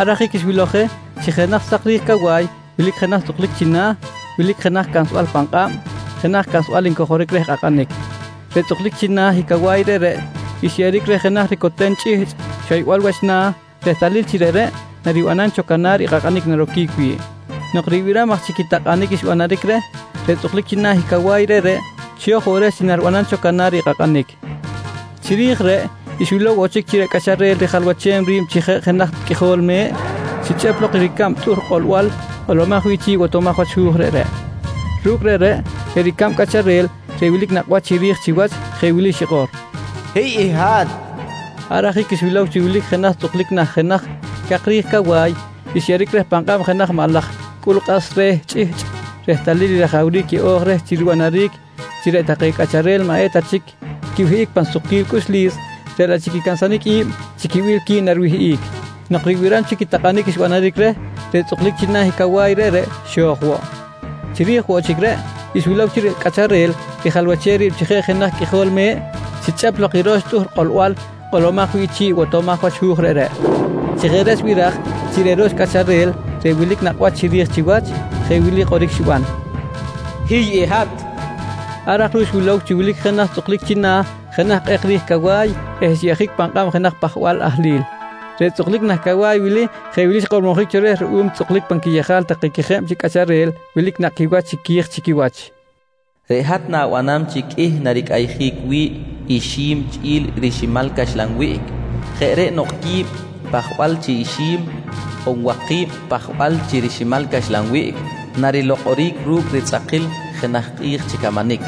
Ar ajic xwilow je chi jenaj sak ri̱j cawa̱y wilic jenaj tzꞌuklic china̱, wilic jenaj cansbal pan kꞌab jenaj cansbal ncojoric reh kꞌakꞌanic. Reꞌ tzꞌuklic china̱ i cawa̱y reꞌreꞌ xyeꞌeric reh jenaj ricoten chꞌihchꞌ xoybal wach na̱ rehtalil chi reꞌreꞌ naribanam cho canar i kꞌakꞌanic naroquic wi̱ꞌ. Nok ribiram aj chic i takꞌanic xbanaric reh, reꞌ tzꞌuklic china̱ i cawa̱y reꞌreꞌ xo̱j woꞌ reh chi nariban cho canar i kꞌakꞌanic. Chiri̱j reꞌ, xwilow woꞌ chic chi reꞌ Cꞌacharel rijalwachem ri̱b chi jeꞌ jenaj Qꞌuijol Me̱ꞌ xichꞌep lok i ricab tꞌuhr kꞌolbal kꞌolomaj wi̱ꞌ chi̱ꞌ i botomaj wach hu̱j reꞌreꞌ. Ru̱cꞌ reꞌreꞌ, reꞌ ricab cꞌacharel reꞌ wilic nakꞌ wach chiri̱j chiwach jeꞌ wili xikꞌor: «Hiy i hat! nqui xikꞌor. Ar ajic xwilow chi wilic jenaj tzꞌuklic nah jenaj cak ri̱j cawa̱y xyeꞌeric reh pan kꞌab jenaj maꞌ laj cꞌul kꞌas re̱ chꞌihchꞌ rehtalil i rajawric yeꞌo̱j reh chi ribanaric chi reꞌ take cꞌacharel maꞌ eta chic quiwihꞌic pan sukquil cꞌuxlis, reꞌ laꞌ chic i cansanic i̱b chi quibil qui̱b nariwihꞌic. Nok ribiram chic i takꞌanic xbanaric reh, reꞌ tzꞌuklic china̱ i cawa̱y reꞌreꞌ xo̱j woꞌ. Chiri̱j woꞌ chic reꞌ, xwilow chi reꞌ Cꞌacharel rijalwachem ri̱b chi jeꞌ jenaj Qꞌuijol Me̱ꞌ xichꞌep lok i roxtꞌuhr kꞌolbal kꞌolomaj wi̱ꞌ chi̱ꞌ i botomaj wach hu̱j reꞌreꞌ. Chi jeꞌ reꞌ xbiraj chi reꞌ ro̱x cꞌacharel reꞌ wilic nakꞌ wach chiri̱j chiwach jeꞌ wili kꞌoric xiban: «Hiy i hat! nqui xikꞌor. Ar aj ruꞌ xwilow chi wilic jenaj tzꞌuklic china̱ jenaj kꞌek ri̱j cawa̱y eh xyeꞌjic pan kꞌab jenaj pajbal ahlil. Reꞌ tzꞌuklic nah cawa̱y wili jeꞌ wili xkꞌormojic cho reh ruꞌum i tzꞌuklic pan quiyejal take quejeb chi cꞌacharel wilic nakꞌ quiwach chiqui̱j chi quiwach: «Reꞌ hat na̱banam chi qꞌuih naricꞌayjic wi̱ꞌ ixi̱m chꞌi̱l riximal caxlan wiꞌc. Jeꞌ reꞌ nok quib pajbal chi ixi̱m on waki̱b pajbal chi riximal caxlan wiꞌc, narilokꞌoric ru̱cꞌ ritzꞌakil i jenaj kꞌi̱j chi camanic.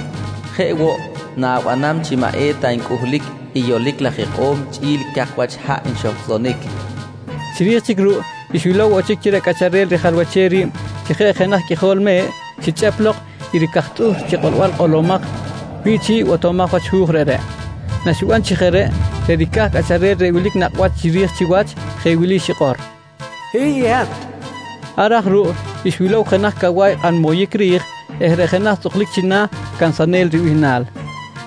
Jeꞌ woꞌ na̱banam chi maꞌ eta ncꞌuhlic i yolic laj ikꞌo̱m chꞌi̱l cak wach haꞌ nxohcꞌsonic, nqui xkꞌormojic reh na xo̱j. Chiri̱j chic ruꞌ xwilow woꞌ chic chi reꞌ Cꞌacharel rijalwachem ri̱b chi jeꞌ jenaj Qꞌuijol Me̱ꞌ xichꞌep lok i ricaj tꞌuhr chi kꞌolbal kꞌolomaj wi̱ꞌ chi̱ꞌ i botomaj wach hu̱j reꞌreꞌ. Naxiban chi jeꞌ reꞌ, reꞌ ricaj cꞌacharel reꞌ wilic nakꞌ wach chiri̱j chiwach, jeꞌ wili xikꞌor: «Hiy i hat! nqui xikꞌor. Ar aj ruꞌ xwilow jenaj cawa̱y kꞌan moyic ri̱j eh reꞌ jenaj tzꞌuklic china̱, “Cansanel” ribihnal.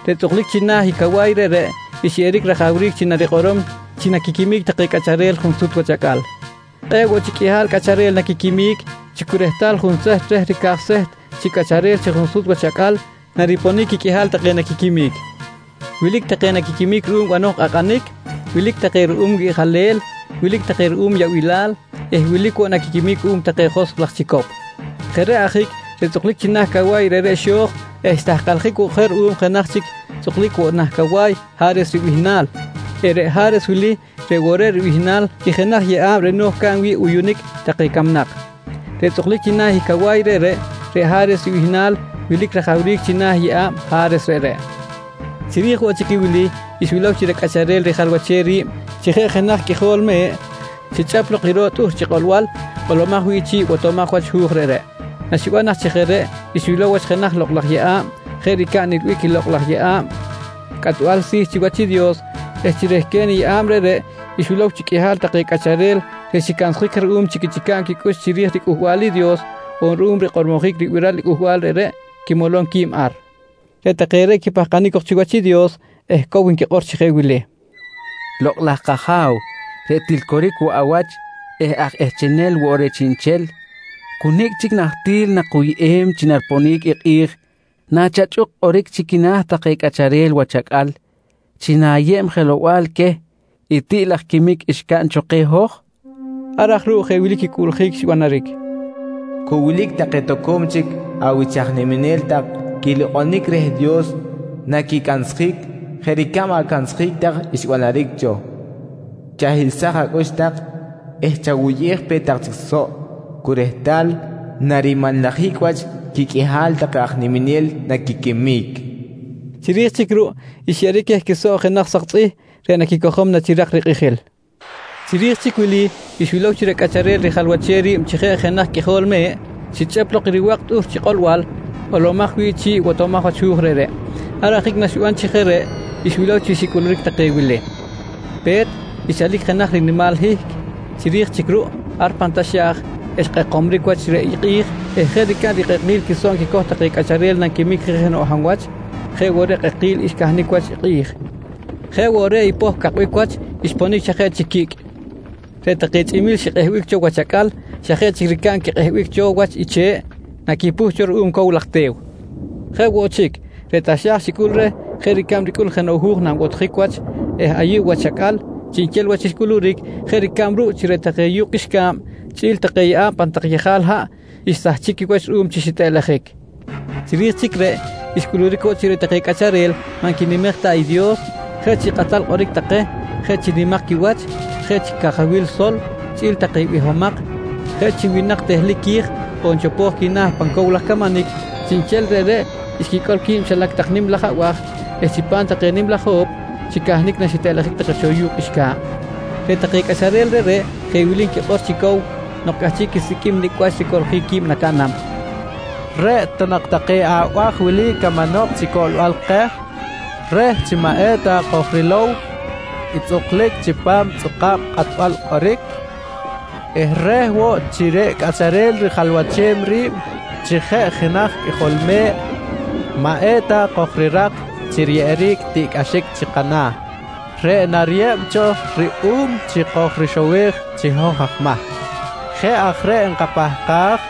Reꞌ tzꞌuklic china̱ i cawa̱y reꞌreꞌ xyeꞌeric rajawric chi narikꞌorom chi naquiquimic take cꞌacharel junsut wach acꞌal. Kꞌe̱ꞌ woꞌ chic qꞌuihal cꞌacharel naquiquimic chi cu rehtal junseht reh ricaj seht chi cꞌacharel chi junsut wach acꞌal nariponic quiqꞌuihal take naquiquimic. Wilic take naquiquimic ruꞌum banoj kꞌakꞌanic, wilic take ruꞌum wiꞌjalel, wilic take ruꞌum yaꞌbilal eh wilic woꞌ naquiquimic cuꞌum take joskꞌ laj chicop. Jeꞌ reꞌ ajic reꞌ tzꞌuklic china̱ i cawa̱y reꞌreꞌ xo̱j eh xtahkaljic woꞌ je ruꞌum jenaj chic tzꞌuklic woꞌ nah cawa̱y “Ha̱res” ribihnal eh reꞌ “Ha̱res” wili reꞌ woꞌ reꞌ ribihnal i jenaj yeꞌa̱b reꞌ no̱j caꞌn wi̱ꞌ uyunic take camnak. Reꞌ tzꞌuklic china̱ i cawa̱y reꞌreꞌ, reꞌ “Ha̱res” ribihnal wilic rajawric china̱ i yeꞌa̱b “Ha̱res” reꞌreꞌ. Chiri̱j woꞌ chic i wili, xwilow chi reꞌ Cꞌacharel rijalwachem ri̱b chi jeꞌ jenaj Qꞌuijol Me̱ꞌ xichꞌep lok i ro̱ꞌ tꞌuhr chi kꞌolbal kꞌolomaj wi̱ꞌ chi̱ꞌ i botomaj wach hu̱j reꞌreꞌ. Naxiban aj chi jeꞌ reꞌ, xwilow wach jenaj lokꞌ laj yeꞌa̱b jeꞌ ricab nilbic i lokꞌ laj yeꞌa̱b cꞌatbal si̱ chiwach i Dios eh chi rehquen i yeꞌa̱b reꞌreꞌ xwilow chi qꞌuihal take cꞌacharel reꞌ xicansjic ruꞌum chi quichꞌica̱b quicꞌux chiri̱j riCꞌuhbal i Dios on ruꞌum rikꞌormojic ribiral i cꞌuhbal reꞌreꞌ, quimolom qui̱b ar. Reꞌ take reꞌ quipahkanic cok chiwach i Dios eh cow nquikꞌor chi jeꞌ wili: «Lokꞌ laj kAja̱w reꞌ til coric woꞌ awach eh aj ehchenel woꞌ reh chiꞌnchel, cu nicꞌ chic nahtil nakuyꞌem chi nariponic i kꞌi̱j nachachꞌuk kꞌoric chi quina̱ take cꞌacharel wach acꞌal chi na̱yeb jelow-bal queh i tiꞌ laj quimic xcaꞌn cho keh hoj? nqui take. Ar aj ruꞌ jeꞌ wili quicꞌuꞌljic xbanaric: «Cu wilic take toco̱m chic awich aj niminel tak quilokꞌonic reh Dios naquicansjic jeꞌ ricab acansjic tak xbanaric cho. Chahiꞌlsaj acꞌux tak eh chawuyꞌej pe tak chic soꞌ cu rehtal narimanlajic wach quiqꞌuihal take aj niminel naquiquimic, nqui xicꞌuꞌljic wi̱ꞌ. Chiri̱j chic ruꞌ xyeꞌeric queh quisoꞌ jenaj sak tzꞌih reꞌ naquicojom nachirak rikꞌijil. Chiri̱j chic wili, xwilow chi reꞌ Cꞌacharel rijalwachem ri̱b chi jeꞌ jenaj Qꞌuijol Me̱ꞌ xichꞌep lok i riwa̱k tꞌuhr chi kꞌolbal kꞌolomaj wi̱ꞌ chi̱ꞌ i botomaj wach hu̱j reꞌreꞌ. Ar ajic naxiban chi jeꞌ reꞌ xwilow chi xicꞌuluric take wili: Pe̱t, xchalic jenaj rinimal hihc. Chiri̱j chic ruꞌ ar pan taxa̱j, xkꞌekomric wach i kꞌi̱j eh jeꞌ ricab rikꞌekil quisoꞌ nquicoj take cꞌacharel nanquimic je jenoꞌ hab wach jeꞌ woꞌ reꞌ kꞌekil xcahnic wach i kꞌi̱j. Jeꞌ woꞌ reꞌ i poh cakbic wach xponic xa jeꞌ chic quicꞌ. Reꞌ take chꞌimi̱l xikꞌehbic cho wach acꞌal xa jeꞌ chic ricab quikꞌehbic cho wach i che̱ꞌ naquipuh cho ruꞌum cow laj te̱w. Jeꞌ woꞌ chic, reꞌ taxa̱j xicꞌul reh jeꞌ ricab ricꞌul jenoꞌ hu̱j nanbotjic wach eh ayuꞌ wach acꞌal chiꞌnchel wach xcꞌuluric, jeꞌ ricab ruꞌ chi reꞌ take yu̱kꞌ qꞌuixca̱b chꞌi̱l take yeꞌa̱b pan tak yejal haꞌ, xsahchic quiwach ruꞌum chi xitꞌeꞌlejic. Chiri̱j chic reꞌ, xcꞌuluric woꞌ chi reꞌ take cꞌacharel maꞌ nquinimej ta i Dios, jeꞌ chi kꞌatal kꞌoric take, jeꞌ chi nimak quiwach, jeꞌ chi cajawil sol, chꞌi̱l take bihomak, jeꞌ chi winak tehlic qui̱j on chopo̱j quina̱ pan cow laj camanic, chiꞌnchel reꞌreꞌ xquicꞌol qui̱b xilac tak nim laj abaj eh chipam take nim laj ho̱p xicahnic naxitꞌeꞌlejic take cho yu̱kꞌ qꞌuixca̱b. Reꞌ take cꞌacharel reꞌreꞌ jeꞌ wili nquikꞌor chi cow nok cꞌahchiꞌ quisiqꞌuim nicꞌ wach ricoꞌljic qui̱b nacaꞌnam: «Reꞌ ta nak take abaj wili camanok chi cꞌolbal keh reh chi maꞌ eta kojrilow i tzꞌuklic chipam i tzꞌuka̱b kꞌatbal kꞌoric eh reh woꞌ chi reꞌ Cꞌacharel rijalwachem ri̱b chi jeꞌ jenaj Qꞌuijol Me̱ꞌ maꞌ eta kojrirak chi riyeꞌeric tiꞌcꞌaxic chi kana̱ reꞌ nariyeb cho ruꞌum reh chi kojrixowej chi hoj aj mahc. Jeꞌ aj reꞌ nkapahkaj